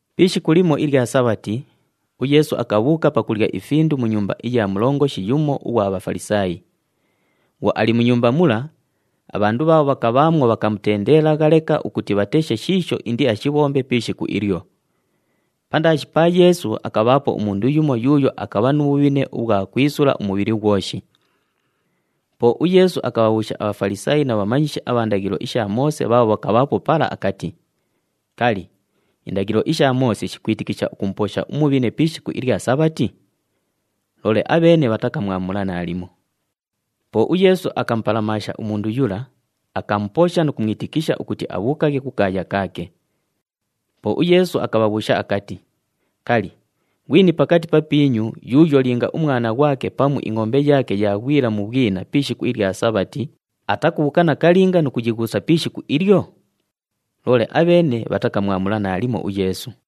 Pi ishiku limo ilya Sabhati, uYeesu akabhuuka pakulya ifindu mu nyumba iya mulongoshi yumo ughwa Bhafalisaayi. Bhwo ali mu nyumba mula, abhandu bhaabho bhakabhaamwo bhakamutendeelagha leka ukuti bhateshe shiisho indiashibhombe pi ishiku ilyo. Pandaashi pa Yeesu akabhaapo umundu yumo yuuyo akabha nu bhubhine ubhwa kwisula umubhili ghwoshi. Po uYeesu akabhabhuusha aBhafalisaayi na bhamanyishi abha ndaghilo isha Moose bhaabho bhakabhaapo pala akati, “Kali, indaghilo isha Moose shikwitikisha ukumuposha umubhine pi ishiku ilya Sabhati?” Loole abheene bhatakamwamula naalimo. Po uYeesu akamupalamaasha mundu yula, akamuposha nu kumwitikisha ukuti abhuukaghe kukaaya kaake. Po uYeesu akabhabhuusha akati, “Kali, ghwini pakati papiinyu yuuyo linga umwana ghwake pamu ingʼombe yaake yaaghwila mu bhwina pi ishiku ilya Sabhati atakubhuuka nakalinga nu kuyighuusa pi ishiku ilyo?” Loole abheene bhatakamwamula naalimo uYeesu.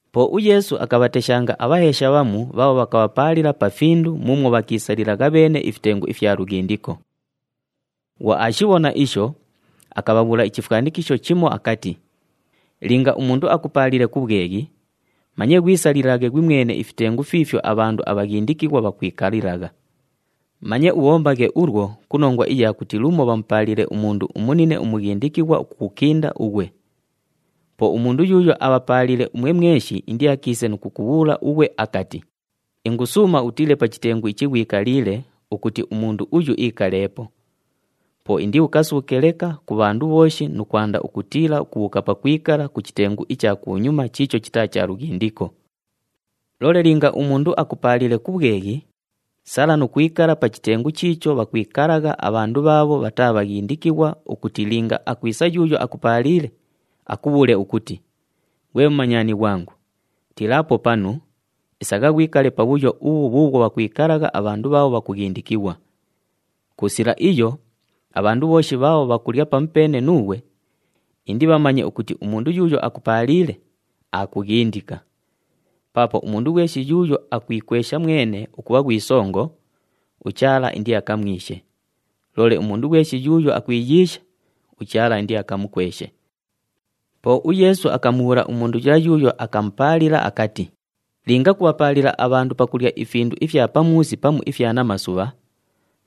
Po uYeesu akabhateshanga abhaheesha bhamu bhaabho bhakabhapaalila pa findu muumwo bhakiisalilagha bheene ifitengu ifya lughindiko. Bhwo aashibhona isho, akabhabhuula ichifwanikisho chimo akati, “Linga umundu akupaaliile ku bhweghi, manye ghwisalilaghe ghwimwene ifitengu fiifyo abhandu abhaghindikighwa bhakwikalilagha. Manye ubhombaghe ulwo ku nongwa iya kuti lumo bhamupaaliile umundu umunine umughindikighwa ukukukinda ughwe. Po umundu yuuyo abhapaaliile umwe mweshi indiakiise nu kukubhuula ughwe akati, ‘Ingusuuma utiile pa chitengu ichi ghwikaliile ukuti umundu uyu iikaleepo.’ Po indiukasuuke leka ku bhandu bhooshi nu kwanda ukutiila ukubhuuka pakwikala ku chitengu icha kunyuma chiicho chitaa cha lughindiko. “Loole linga umundu akupaaliile ku bhweghi, sala nu kwikala pa chitengu chiicho bhakwikalagha abhandu bhaabho bhataa bhaghindikighwa ukuti linga akwisa yuuyo akupaaliile, akubhuule ukuti, ‘Ghwe mumanyani ghwangu, tiilaapo panu, isagha ghwikale pabhuyo ubhu bhuubhwo bhakwikalagha abhandu bhaabho bhaghindikighwa.’ Ku sila iyo, abhandu bhooshi bhaabho bhakulya pamupeene nuughwe indibhamanye ukuti umundu yuuyo akupaaliile, aakughindika. Paapo umundu ghweshi yuuyo akwikwesha mwene ukubha ghwi songo, uChaala indiakamwishe, loole umundu ghweshi yuuyo akwiyiisha, uChaala indiakamukweshe.” Po uYeesu akamubhuula umundu yula yuuyo akamupaalila akati, “Linga kubhapaalila abhandu pakulya ifindu ifya pamuusi pamu ifya namasubha,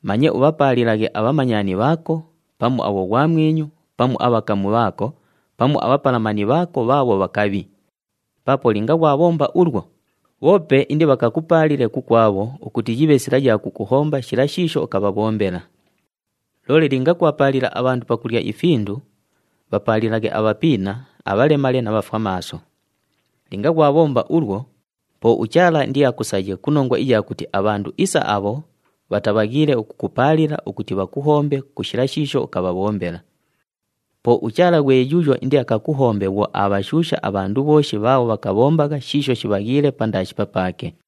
manye ubhapaalilaghe abhamanyani bhaako, pamu abhoghwamwinyu, pamu abhakamu bhaako, pamu abhapalamani bhaako bhaabho bhakabhi. Paapo linga ghwabhomba ulwo, bhoope indibhakakupaalile kukwabho ukuti yibhe sila ya kukuhomba shila shiisho ukabhabhombela. Loole linga kubhapaalila abhandu pakulya ifindu, bhapaalilaghe abhapiina, abhalemale na bhafwamaaso. Linga ghwabhomba ulwo, po uChaala indiakusaye ku nongwa iya kuti abhandu isa abho bhatabhaghiile ukukupaalila ukuti bhakuhombe ku shila shiisho ukabhabhombela. Po uChaala ghwe yuuyo indiakakuhombe bhwo aabhashuusha abhandu bhooshi bhaabho bhakabhombagha shiisho shibhaghiile pandaashi papaake.”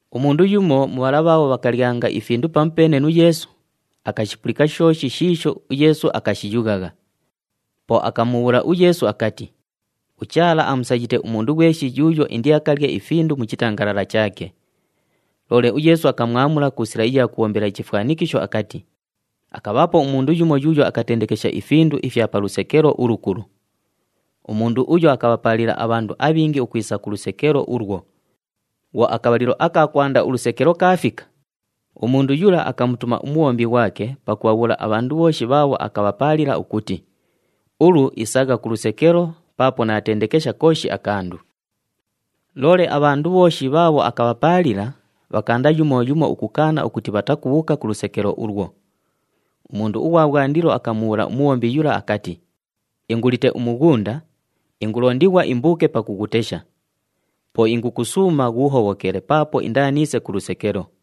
Umundu yumo mu bhala bhaabho bhakalyanga ifindu pamupeene nu Yeesu, akashipulika shooshi shiisho uYeesu akashiyughagha. Po akamubhuula uYeesu akati, “UChaala amusayite umundu ghweshi yuuyo indiakalye ifindu mu chitangalala chaake!” Loole uYeesu akamwamula ku sila iya kubhombela ichifwanikisho akati, “Akabhaapo umundu yumo yuuyo akatendekesha ifindu ifya pa lusekelo ulukulu. Umundu uyo akabhapaalila abhandu abhingi ukwisa ku lusekelo ulwo. Bhwo akabhalilo aka kwanda ulusekelo kaafika, umundu yula akamutuma umubhombi ghwake pakubhabhuula abhandu bhooshi bhaabho akabhapaalila ukuti, ‘Ulu isagha ku lusekelo paapo naatendekesha kooshi akandu!’ “Loole abhandu bhooshi bhaabho akabhapaalila, bhakaanda yumo yumo ukukaana ukuti bhatakubhuuka ku lusekelo ulwo. Umundu ughwa bhwandilo akamubhuula umubhombi yula akati, ‘Ingulite umughunda, ingulondighwa imbuuke pakughutesha. Po ingukusuuma ghuuhobhokele paapo indaaniise ku lusekelo.’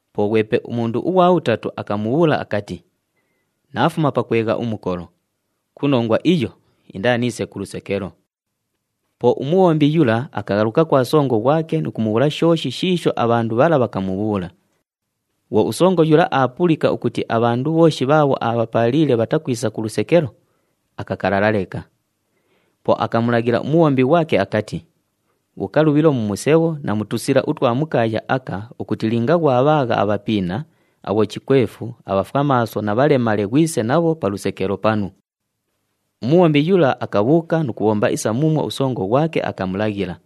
Po ghwepe umundu ughwa bhutatu akamubhuula akati, ‘Naafuma pakwegha umukolo, ku nongwa iyo, indaaniise ku lusekelo.’ “Po umubhombi yula akaghaluka kwa songo ghwake nu kumubhuula shooshi shiisho abhandu bhala bhakamubhuula. Bhwo usongo yula aapulika ukuti abhandu bhooshi bhaabho aabhapaaliile bhatakwisa ku lusekelo, akakalala leka. Po akamulaghila umubhombi ghwake akati, ‘Bhuuka lubhilo mu musebho na mu tusila utwa mu kaaya aka ukuti linga ghwabhaagha abhapiina, abhochikwefu, abhafwamaaso na bhalemale ghwise nabho pa lusekelo panu.’ Umubhombi yula akabhuuka nu kubhomba isa muumwo usongo ghwake akamulaghila.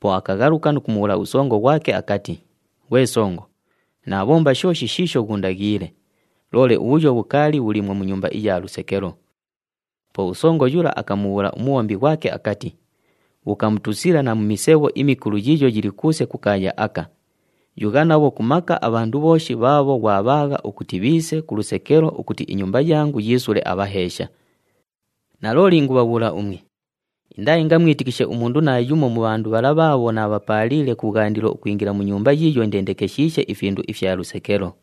Po akaghaluka nu kumubhuula usongo ghwake akati, ‘Ghwe songo, naabhomba shooshi shiisho ghuundaghiile, loole ubhuyo bhukaali bhuliimwo mu nyumba iya lusekelo.’ Po usongo yula akamubhuula umubhombi ghwake akati, ‘Bhuuka mu tusila na mu misebho imikulu yiiyo yili kuuse ku kaaya aka, yugha nabho ku maka abhandu bhooshi bhaabho ghwabhaagha ukuti bhiise ku lusekelo ukuti inyumba yangu yiisule abhaheesha. Nalooli ingubhabhuula umwe, indaaingamwitikishe umundu naayumo mu bhandu bhala bhaabho naabhapaaliile kubhwandilo ukwingila mu nyumba yiiyo indendekeshiishe ifindu ifya lusekelo!’”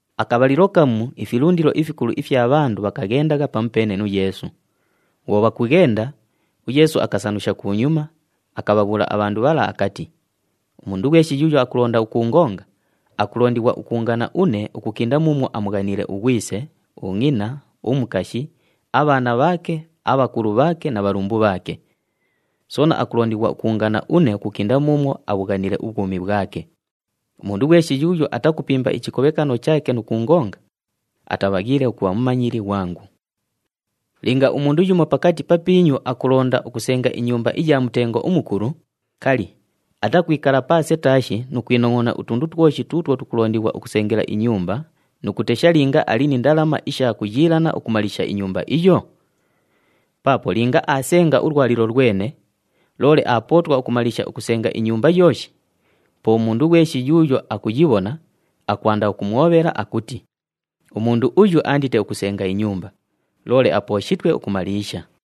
Akabhalilo kamu ifilundilo ifikulu ifya bhandu bhakaghendagha pamupeene nu Yeesu. Bhwo bhakughenda, uYeesu akasanusha kunyuma, akabhabhuula abhandu bhala akati, “Umundu ghweshi yuuyo akulonda ukuungonga, akulondighwa ukuungana une ukukinda muumwo amughaniile ughwise, ungʼina, umukashi, abhaana bhaake, abhakulu bhaake na bhalumbu bhaake. Soona akulondighwa ukuungana une ukukinda muumwo abhughaniile ubhwumi bhwake. Umundu ghweshi yuuyo atakupimba ichikobhekano chaake nu kuungonga, atabhaghiile ukubha mumanyili ghwangu. “Linga umundu yumo pakati papiinyu akulonda ukusenga inyumba iya mutengo umukulu, kali, atakwikala paase taashi nu kwinongʼona utundu twoshi tuutwo tukulondighwa ukusengela inyumba nu kutesha linga ali ni ndalama isha kuyiilana ukumaliisha inyumba iyo? Paapo linga aasenga ulwalilo lwene, loole aapootwa ukumaliisha ukusenga inyumba yooshi, po umundu ghweshi yuuyo akuyibhona, akwanda ukumwobhela, akuti, ‘Umundu uyu aandite ukusenga inyumba, loole apooshitwe ukumaliisha!’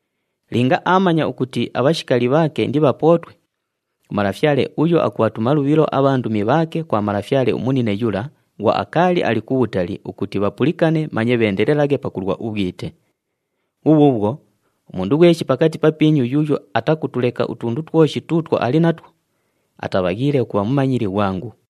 Linga aamanya ukuti abhashikali bhaake indibhapootwe, umalafyale uyo akubhatuma lubhilo abhandumi bhaake kwa malafyale umunine yula bhwo akaali ali kubhutali ukuti bhapulikane manye bheendelelaghe pakulwa ubhwite. Bhubhuubhwo, umundu ghweshi pakati papiinyu yuuyo atakutuleka utundu twoshi tuutwo ali natwo, atabhaghiile ukubha mumanyili ghwangu.”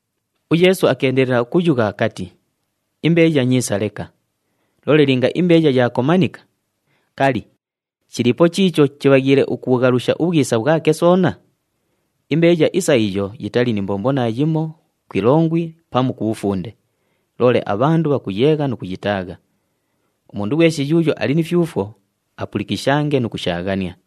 UYeesu akeendelela ukuyugha akati, “Imbeeya nyiisa leka. Loole linga imbeeya yaakomanika, kali, chiliipo chiicho chibhaghiile ukubhughalusha ubhwisa bhwake soona? Imbeeya isa iyo yitali ni mbombo naayimo ku ilongwi pamu ku bhufunde, loole abhandu bhakuyeegha nu kuyitaagha. Umundu ghweshi yuuyo ali ni fyufwo, apulikishange nu kushaaghania!”